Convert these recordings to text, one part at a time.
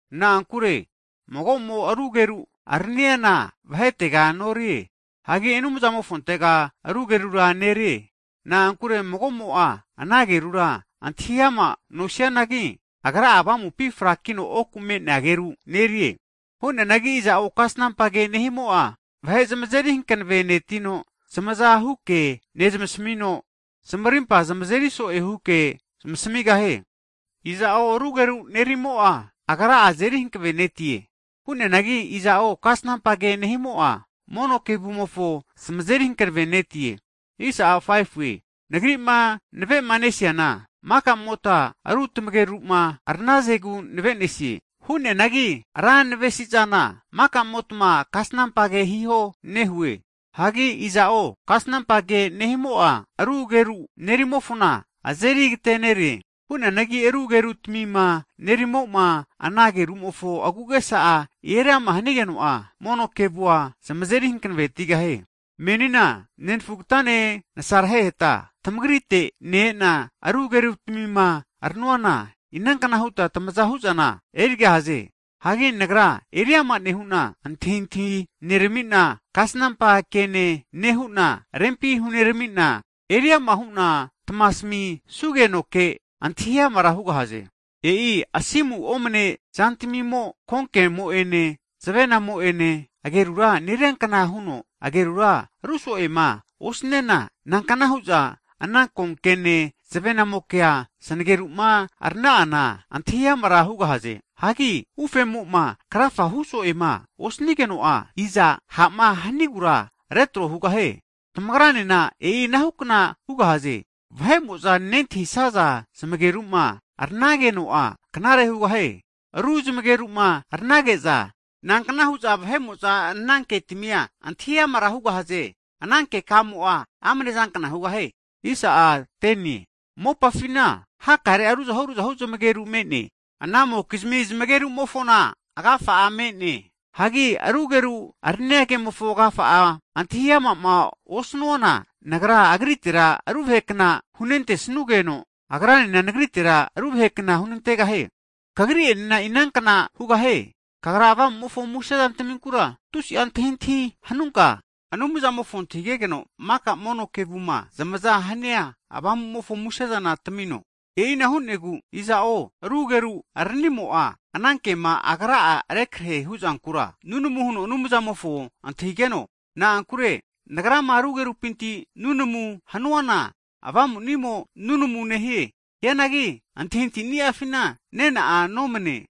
Na'ankure mago'mo ru ageru araniana vahetega norie. Hagi Anumzamofontega ru agerura nerie. Na'ankure mago'mo'a ana agerura antahi ama nosianagi, agra'a avamupi frakino oku me'nea ageru nerie. Hu'neanagi iza'o kasnampa ke nehimo'a, vahe zamazeri hankavenetino, zmazahuke nezmasamino, zamarimpa zamazeri so'e huke zmasamigahie. Iza'o ru ageru nerimo'a, agra'a azeri hanavenetie. Hu'neanagi iza'o kasnampa ke nehimo'a, mono kevumofo zamazeri hanavenetie. Nagri'ma navemanesiana, maka'mota ru tamageru'ma aranazegu navenesie. Hu'neanagi ra navesi'zana, maka'motma kasnampa ke hiho nehue. Hagi iza'o kasnampa ke nehimo'a, ru ageru nerimofona azeri agatere'ne. Hu'neanagi ru agerutamima nerimo'ma, ana ageru'mofo agu'agesa eri ama hanigeno'a, mono kevua zamazeri hanavetigahie. Menina nenfugatane nasareheta, tamagrite ne-ena ru agerutmima ranuana, inankna huta tamaza hu'zana erigahaze? Hagi nagra eriama nehu'na, antahintahi nerami'na, kasnampa kene nehu'na, rempi hunerami'na, eriama hu'na tmasamisugenoke, antahi amara hugahaze. E'i asimu omne zantamimo, konkemo'ene zavenamo'ene ageru neriankna huno, ageru ru so'ema osaniana nankna hu'za ana konkene zavenamokea zanageru'ma arana'ana antahi amara hugahaze? Hagi ufemo'ma krafa hu so'ema osnigeno'a, iza ha'ma hanigura retro hugahie? Tamagranena e'i anahukna hugahaze. Vahe'mo'za nentahisaza zmageru'ma aranageno'a knare hugahie. Ru zmageru'ma aranage'za, nankna hu'za vahe'mo'za ana ketmia antahi amara hugahaze? Ana keka'amo'a amne'zankna hugahie. Mopafina hakare'a ruzahu ruzahu zmageru me'ne, anamokizmi zmageru'mofona agafa'a me'ne. Hagi ru ageru arania kemofo agafa'ama antahi ama'ma osnuana, nagra agritera ru vahe kna hunentesnugeno, agranena nagritera ru vahekna hunantegahie. Tamagra'enena e'inahukna hugahaze. Tamagra Anumzamofo Avamu'mofo musezantminku'ma tusi'a antahintahima hanuta, maka mono kevuma zamaza hania Ruotge Avamumofo musezanku hankavetita eriama hiho. E'ina hu'negu, iza'o ru ageru aranimo'a, ana kema agra'a rekrehe hu'zankura, nunamu huno Anumzamofo antahigeno. Na'ankure nagrama ru agerupinti'ma nunamuma hanuana, avamuni'amo nunamuna nehie. Hianagi antahintahi ni'afina nena'a nomane.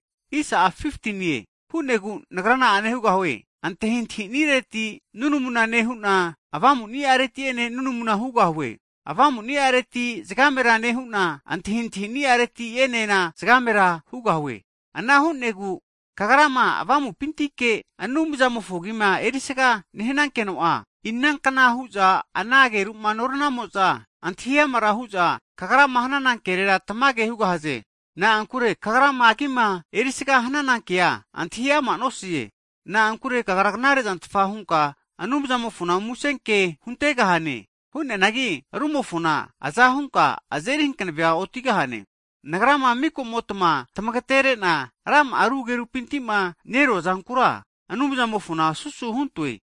Hu'negu nagra na'a hugahue? Antahintahini'areti nunamuna nehu'na, Avamuni'areti ene nunamuna hugahue. Avamuni'areti zagamera nehu'na, antahintahini'areti enena zagamera hugahue. Ana hu'negu kagrama avamupintike Anumzamofo agima erisaga nehanankeno'a, inankna hu'za ana ageru'ma noranamo'za antahi amara hu'za, kagrama hanana kerera tamage hu'za hugahaze? Na'ankure kagrama agima erisaga hananankea antahi ama' nosaze. Na'ankure kagra, knare zantfa hunka Anumzamofo musenke huntegahane. Hu'neanagi rumofona aza hunka azeri hankave otigahane. Nagrama mika'motma tamagetere'na rama'a ru agerupinti'ma neruazankura, Anumzamofona susu huntoe.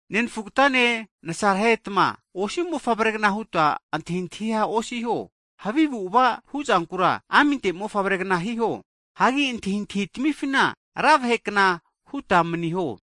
Nenafugatane nasarehetma, osi mofavregna huta antahintahia osiho, havi avu'ava huzankura aminte mofavre'gna hiho. Hagi antahintahi tamifina ra vahe kna huta maniho.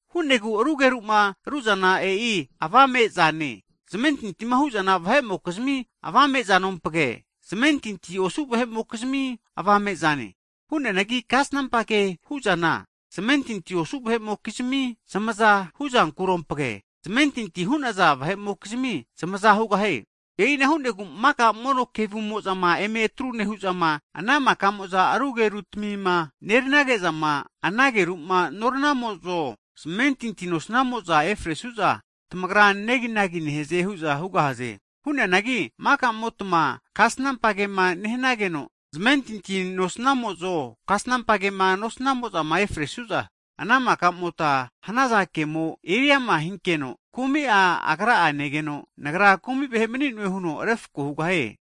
Hu'negu ru ageru'ma ru'zana e'i avame'zane, zamentinti hu'naza vahe'mokizmi avame zanompage, zamentinti osu vahe'mokizmi avame'zane. Hu'neanagi kasnampa kema hu'zana, zamentinti osu vahe'mokizmi zamaza hu'zankurompage, zamentinti hu'naza vahe'mokizmi zamaza hugahie. E'ina hu'negu maka mono kevumo'zama eme atru nehu'zama ana maka'mozama ru agerutmima neranage'zama, ana ageru'ma noranamo'zo, zamentinti nosnamo'za efresu'za, tamagra neginagi nehaze hu'za hugahaze. Hu'neanagi maka'motma kasnampa kema nehanageno, amentinti nosanimo'ene, kasanampa kema nosanimo'ma efresuno'a ana maka'mota hanaza kemo eriama hinkeno, kumi'a agra negeno, nagra kumi vahe mani'noe huno refko hugahie.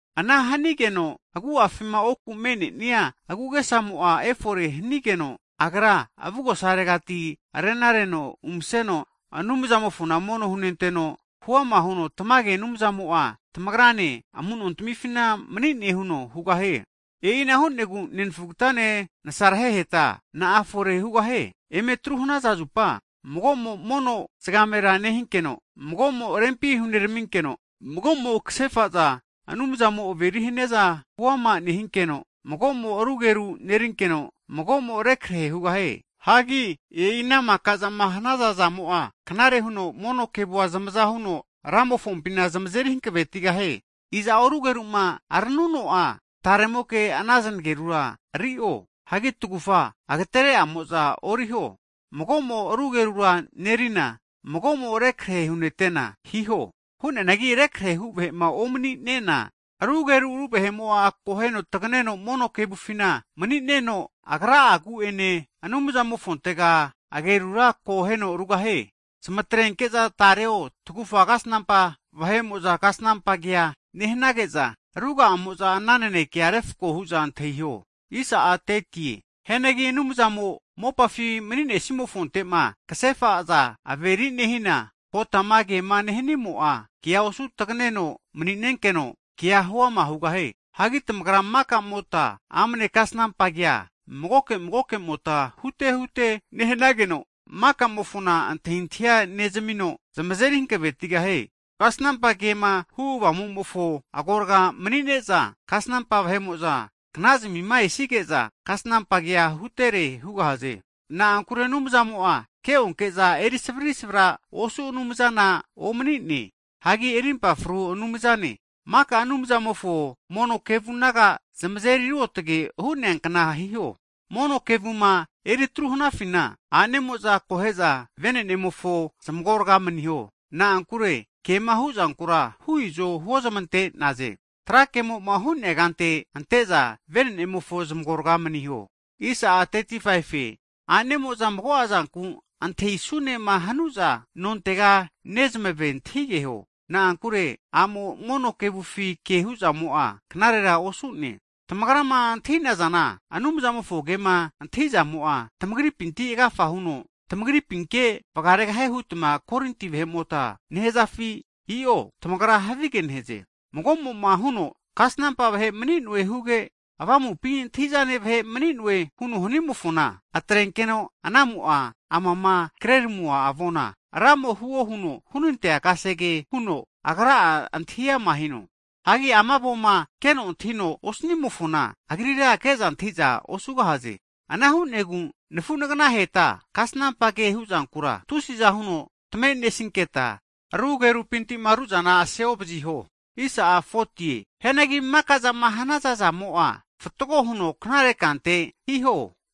Ana hanigeno agu'afima oku me'ne'nia agu'agesamo'a efore hanigeno, agra arena reno avugosaregati umaseno, Anumzamofona mono hunenteno, hu'ama huno tamage Anumzamo'a tamagrane amu'nontamifi mani'ne huno hugahie. E'ina hu'negu nenfugatane nasareheheta na'a efore hugahie? Eme atru hanaza zupa, mago'mo mono zagamera nehinkeno, mago'mo rempi huneraminkeno, mago'mo kasefa zama Anumzamo'ma averi haniaza huama nehinkeno, mago'mo ru ageru'ma nerinkeno, mago'mo rekrehe hugahie. Hagi e'i ana maka'zama hanaza zamo'a, knare huno mono kevua zamaza huno, Ramofompina zamazeri hankavetigahie. Iza'o ru ageru'ma aranuno'a, taremoke ana znagerura ri'o. Hagi tagufa agetere'amo'za oriho. Mago'mo ru agerura nerina, mago'mo rekrehe hunete'na hiho. Hu'neanagi rekrehe hu vahe'ma omani'nena, ru ageru ru vahe'mo'a akoheno taganeno mono kevufina mani'neno, agra'a Anumzamofontega agerura akoheno rugahie. Zametrenke'za tareo tagufa kasnampa vahe'mo'za kasnampa kea nehanage'za ruga'amo'za ana nanekea refko hu'za antahiho. Hianagi Anumzamo mopafi mani'nesimofonte'ma kasefa'za averi nehina, kotama kema nehanimo'a, kea osu taganeno mani'nenkeno, kea huama hugahie. Hagi tamagra maka'mota amne kasnampa kea magoke magoke'mota hutehute nehnageno, maka'mofona antahintahia nezamino, zamazeri hankavetigahie. Kasnampa kema hu avamu'mofo agorga'a mani'ne'za, kasnampa vahe'mo'za knazmima esige'za, kasnampa kea hutere hugahaze. Na'ankure Anumzamo'a ke'onke'za eri savrisavrahu Anumzana omani'ne, hagi rimpa fru Anumzane. Maka Anumzamofo mono kevu naga zamazeri ruotge hu'neankna hiho. Mono kevuma eritru hanafina, a'nemo'za akohe'za vene'nemofo zamagorga maniho. Na'ankure kema hu'zankura hu izo huozmante'naze. Tra kemo'ma hu'nea kante ante'za vene'nemofo zamagorga'a maniho. Hagi a'nemo'za mago'a zanku antahisunema hanu'za, nontega nezmave antahigeho, na'ankure a'mo mono kevufi ke hu'zamo'a knarera osu'ne. Tamagrama antahi'zana Anumzamofo kema antahizamo'a, tamagripinti agafa huteno, tamagripinke vagaregahie hutma Korinti vahe'mota nehazafi? I'o, tamagra havige nehaze. Mago'mo'ma huno kasnampa vahe mani'noe huge, avamupi antahi'zane vahe mani'noe huno hanimofona, atrenkeno anamo'a amama kreramua avonkura, Ramo huo huno hunte'nea kasege huno agra'a antahi'ama hino. Hagi ama avoma keno antahino osanimofona, agrira ke'za antahi'za osugahaze. Ana hu'negu nafu nagnaheta kasnampa ke hu'zankura tusiza huno tamenesinketa, ru agerupinti'ma ru'zana aseovaziho. Hianagi maka zama hanaza zamo'a, fatgo hina knare kankamunte eriteta hiho.